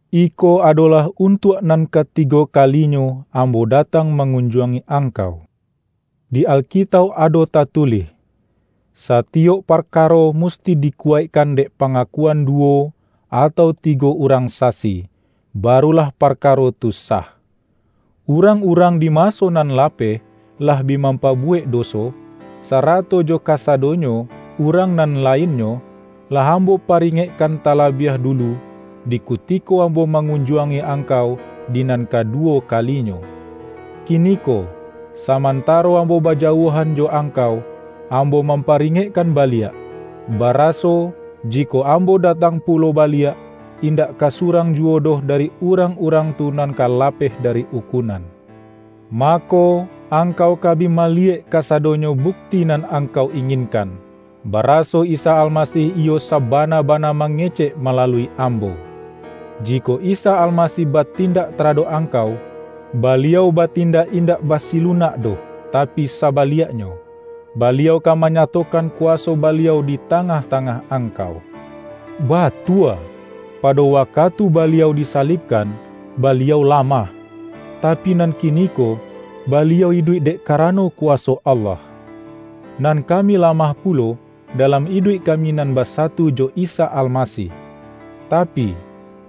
Iko adolah untuak nan katigo kalinyo ambo datang mangun-juangi angkau. Di Alkitauk ado tatu-lih,”Satiyok parkaro musti dikuwaik-kan dek pangakuan duwo, atau tigo urang sasi, barulah parkaro tu sah.” urang-urang di maso nan lapeh lah bi mampabuwek doso, sarato jo ka-sadonyo urang nan lainnyo, lah am-bo paringekkan talabiah dulu, di ku-tiko ambo mangunjuangi angkau di nan kaduwo kalinyo. Kiniko, saman-taro ambo bajauahan jo angkau, am-bo mamparingekkan baliak, baraso, jikok ambo datang pulo baliak, indak ka surang juwo doh dari urang-urang tu nan ka lapeh dari ukunan. Mako, angkau ka bi maliyek kasadonyo buk-ti nan angkau inginkan, baraso Isa Almasih iyo sabana-bana mangecek malalui ambo. Jikok Isa Almasih batin-dak taradok angkau, Baliau batindak indak basilunak doh, tapi sabaliaknyo, Baliau ka manyatokan kuwaso Baliau di tangah-tangah angkau. Batua, pado wakatu Baliau disalibkan, Baliau lamah, tapi nan kiniko Baliau iduik dek karano kuwaso Allah. Nan ka-mi lamah pulo dalam iduik kami nan basatu jo Isa Almasih, tapi,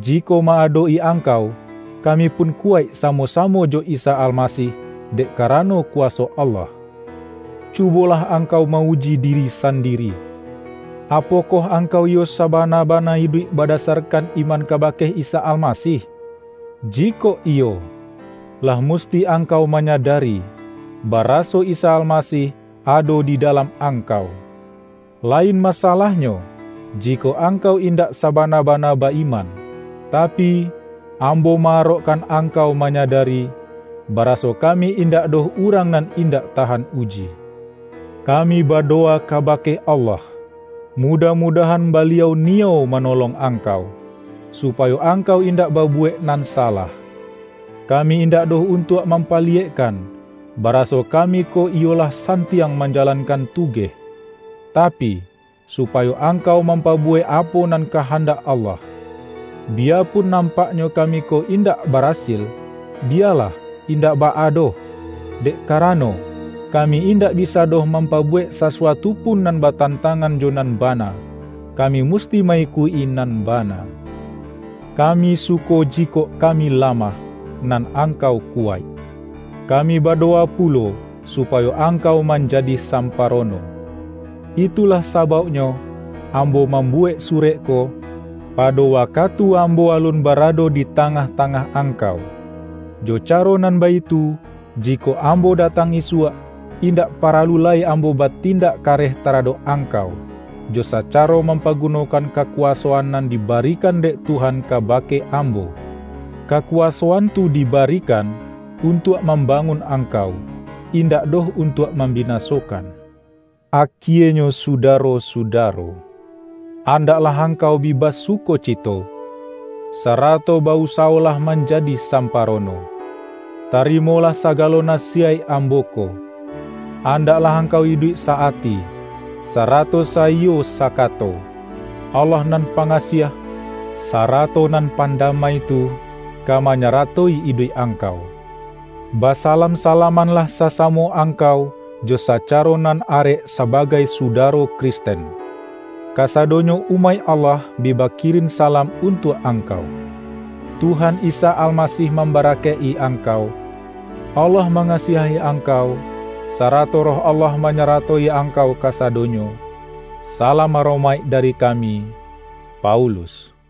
jikok ma-adok-i angkau, kami pun kuwaik sa-mo-samo jo Isa Almasih dek karano kuwaso Allah. Cubolah angkau ma-uji diri san-diri, apokoh angkau iyo sabana-ba-na iduik badasarkan iman kabake Isa Almasih! Jikok iyo, lah musti angkau manyadari, baraso Isa Almasih ado di dalam angkau! - lain masalahnyo, jikok angkau indak sabana-bana ba-iman. Tapi, ambo ma-arokkan ang-kau manyadari, baraso kami indak doh urang nan indak tahan uji. Ka-mi badowa kabake Allah, mudah-mu-dahan Baliau niyo manolong angkau, supayo angkau indak babuwek nan salah. Kami indak doh untuak mam-paliyekkan, baraso kami ko iyo lah santiang manjalankan tugeh, tapi, su-payo angkau mampabuwek apo nan kahandak Allah - biyapun nampak-nyo kami ko indak barasil, biyalah, indak baa doh! Dek karano, kami indak bisa doh mampabuwek sasu-atu pun nan batantangan jo nan ba-na; kami musti ma-ikuik-i nan bana. Kami suko jikok kami lamah, nan angkau kuwaik. Kami badowa pu-lo supayo angkau manjadi samparo-no. Itulah sabauknyo ambo mam-buwek surek ko, pado wakatu ambo alun barado di tangah-tangah ang-kau. Jo caro nan baitu, jikok ambo datang isuak, indak paralu lai ambo batindak kareh taradok angkau, jo sacaro mampagunokan kakuwaso-an nan dibarikan dek Tuhan kabake ambo. Kakuwasoan tu dibarikan, un-tuak mambangun angkau, indak doh untuak mambinasokan. Akienyo sudaro-sudaro, andaklah angkau bi basukocito, sarato ba-usa-wolah manjadi samparono. Tarimo-lah sagalo nasiyaik ambo ko. Andak-lah angkau iduik sa-ati, sarato saiyo sakato. Allah Nan Pangasiah, sara-to nan pandamai tu, ka manyaratoi iduik angkau. Basalam-salamanlah sasamo ang-kau jo sacaro nan arek sabagai suda-ro Kristen. Kasadonyo umaik Allah bi bakirin salam untuak angkau. Tuhan Isa Almasih mambarakaik-i angkau, Allah mangasiahi angkau, sarato Roh Allah manyaratoi angkau kasadonyo! Salam aromaik dari kami, Paulus